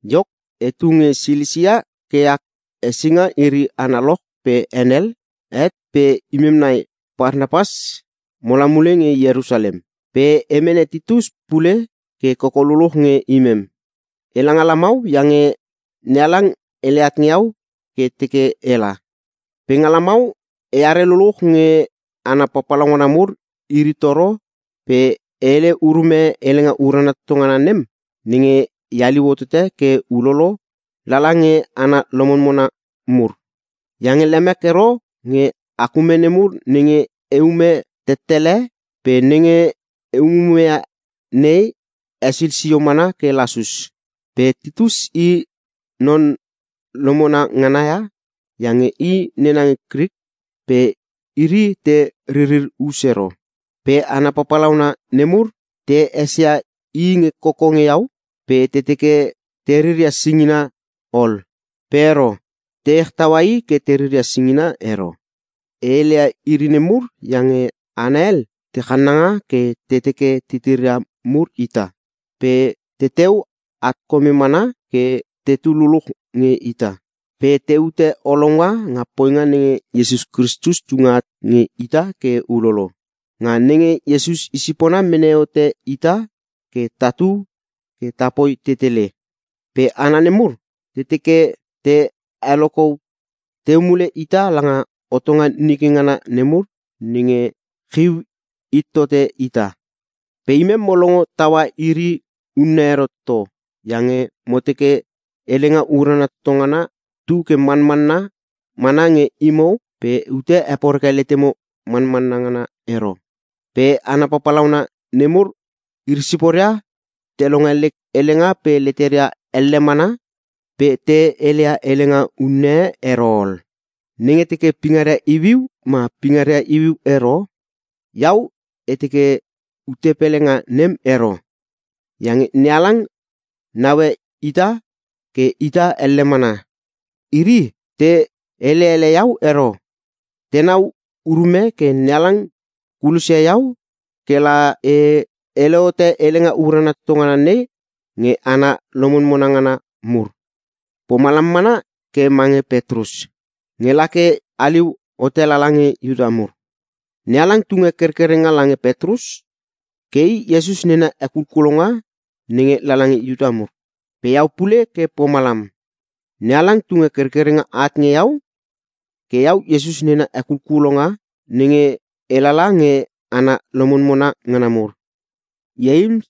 Iok, etu nge Silisia ke ak hesinga iri analoch pe henel het pe imem nai Parnapas mola mule nge Ierusalem. Pe e mene Titus pule ke koko luluch nge imem. Ela nga lamau iange NeHalang hele at nge iau ke teke ela. Pe nga lamau, eare luluch nge hana papalauna mur iri toro pe e hele urume Helenga Urana Toto Ngana nem nenge e haliu hotote ke ulolo lala nge hana lomonmona mur. Iange lemek ero nge ak ume nemur nenge eume tettele pe nenge e umume ia nei hesil sio mana ke lasus. Pe Titus i non lomona ngana ia iange i nena nge Krik pe iri te ririr us ero. Pe hana papalauna nemur te esia i nge koko nge iau pe te teke te riria singina ol. Pe ero. Te ech taua i ke te riria singina ero. E hele ia iri nemur iange hana hel te chananga ke te teke titiria mur ita, pe teteu at kome mana ke tetu luluch nge ita, pe teute olounga nga poinga nenge Iesus Kristus tunge at nge ita ke ulolo. Nga nenge Iesus i sipona mene hote ita ke tatu ke tapoi tetele. Pe hana nemur te teke te heloko teu mule ita langa hotonga nike ngana nemur nenge chiu hit tote ita. Pe imem mo longo taua iri unne ero toto, iange mo teke Helenga Urana Toto Ngana tu ke manmanna mana nge imo pe ute heporeke letemo manmanna ngana ero. Pe hana papalauna nemur, iri siporia te longe lek helenga pe leteria elle mana pe te hele ia helenga unne e ero ol. (Nenge teke pingaria iuiu ma pingaria iuiu ero, iau e teke ute pele nga nem ero, iange NeHalang naue ita ke ita elle mana.) Iri te hele ele iau ero. Tenau urume ke NeHalang kulos ia iau ke la e hele hote Helenga Urana Toto Ngana nei nge hana lomonmona ngana mur. Pomalam mana ke mange Petrus, nge la ke haliu hote lala nge Iuta mur. NeHalang tunge kerkerenga lange Petrus ke i Iesus nena hekulkulonga nenge lala nge Iuta mur. Pe iau pule ke pomalam. NeHalang tunge kerkerenga at nge iau ke iau Iesus nena hekulkulonga nenge e lala nge hana lomonmona ngana mur. Ieims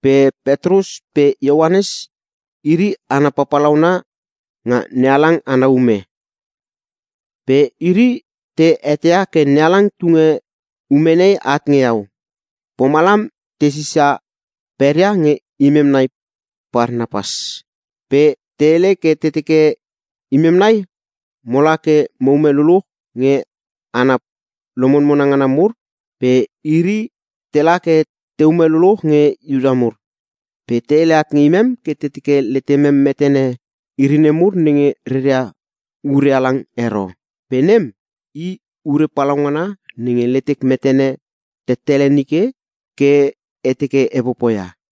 pe Petrus pe Ioanes, iri hana papalauna nga NeHalang ana ume. Pe iri te eteia ke NeHalang tunge ume nei at nge iau. Pomalam te sisa peria nge imem nai Parnapas. Pe te hele ke te teke imem nai mola ke mo ume luluch nge hana lomonmona ngana mur pe iri tela ke teume luluch nge Iuta mur. Pe te hele at nge imem ke te teke letemem metene iri nemur nenge reria ure halang ero. Pe nem, i ure palaungana nenge letek metene tettele nike ke e teke e popoia.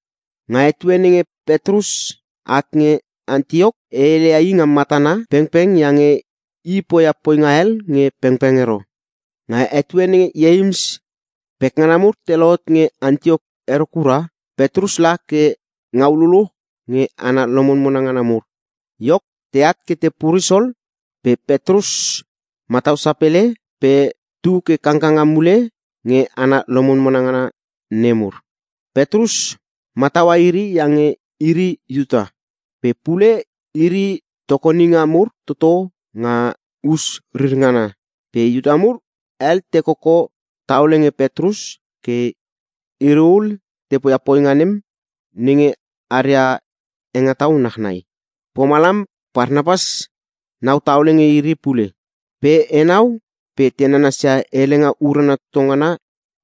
Nga etue nenge Petrus at nge Antiok e heleia i nga matana pengpeng iange i poia poinga hel nge pengpeng ero. Nga etue nenge Ieims pekngana mur te lohot nge Antiok ero kura, Petrus la ke ngau lululuch nge hana lomonmona ngana mur. Iok, teat ke te puris ol pe Petrus matau sapele pe tu ke kangkanga mule nge hana lomonmona ngana nemur. Petrus mataua iri iange iri Iuta. Pe pule iri tokoninga mur toto nga us rir ngana. Pe Iuta mur hel te koko taole nge Petrus ke iri ul te poia poinga nem nenge aria hengetau nachnai. Pomalam Parnapas nau taole nge iri pule. Pe enau pe te nanasia Helenga Urana Toto Ngana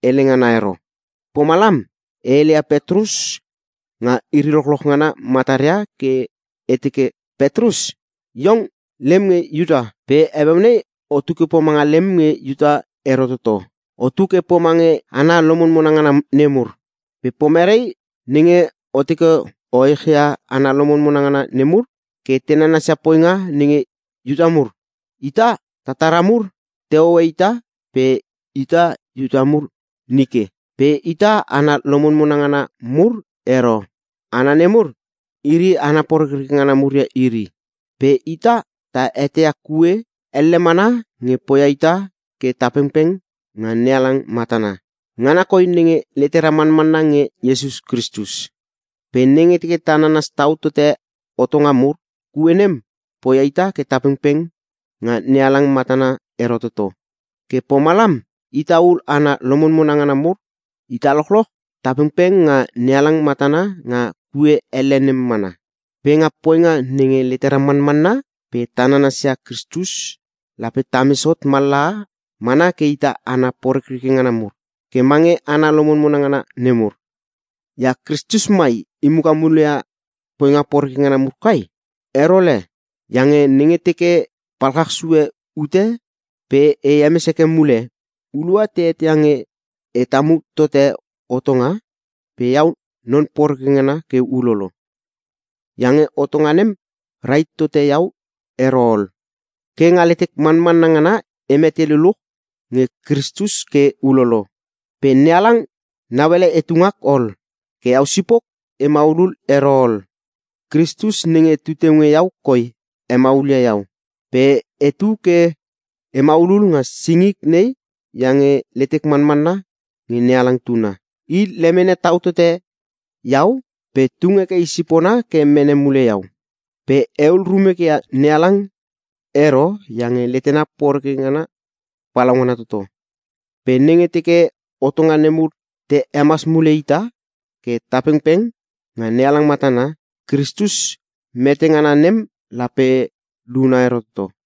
hele ngana ero. Pomalam e heleia Petrus nga iri lochloch ngana mataria ke e teke, “Petrus, iong lem nge Iuta. Pe heueu nei otu ke pomanga lem nge Iuta ero toto. Otu ke pomange hana lomonmona ngana nemur. Pe pomerei nenge o teke o echia hana lomonmona ngana nemur ke te nanasia poinga nenge Iuta mur? “Ita, tatara mur te hoe ita pe ita Iuta mur nike. Pe ita hana lomonmona ngana mur ero. Hana nemur, iri ‘hana porekreke ngana mur’ ia iri. Pe ita ta eteia ke kue elle mana nge poia ita ke ta pengpeng nga NeHalang matana. Ngana koi nenge letera manmanna nge Iesus Kristus. Pe nenge ta nanas tau tote hotonga mur, kue nem poia ita ke ta pengpeng nga NeHalang matana ero toto. Ke pomalam, ita ul hana lomonmona ngana mur, ita lochloch ta pengpeng nga NeHalang matana nga kue elle nem mana. “Pe nga poinga nenge letera manmanna pe ta nanas ia Kristus lape tames hot mallaha mana ke ita hana porekreke ngana mur, ke mange hana lomonmona ngana nemur. Ia Kristus mai I muka muleia poinga poreke ngana mur kai? Ero le! Iange nenge teke e palchach sue ute pe e hemes heke mule, hulua te eteia nge e tamu tote hotonga pe iau non poreke ngana ke ulolo. Iange hotonga nem rahit tote iau ero ol. Ke nga letek manmanna ngana e mete luluch nge Kristus ke ulolo. Pe NeHalang nauele etu ngak ol. Ke iau sipok e maulul ero ol. Kristus nenge tu teu nge iau koi hemaul ia iau. Pe etu ke e maulul nga singik nei iange letek manmanna nge NeHalang Tuna. I lemene tau tote iau pe tung heke i sipona ke mene mule iau. Pe ehul rumek ia NeHalang ero iange letena poreke ngana palaungana toto. Pe nenge teke hotonga nemur te hemas mule ita ke ta pengpeng nga NeHalang matana, Kristus mete ngana nem lape luna ero toto!”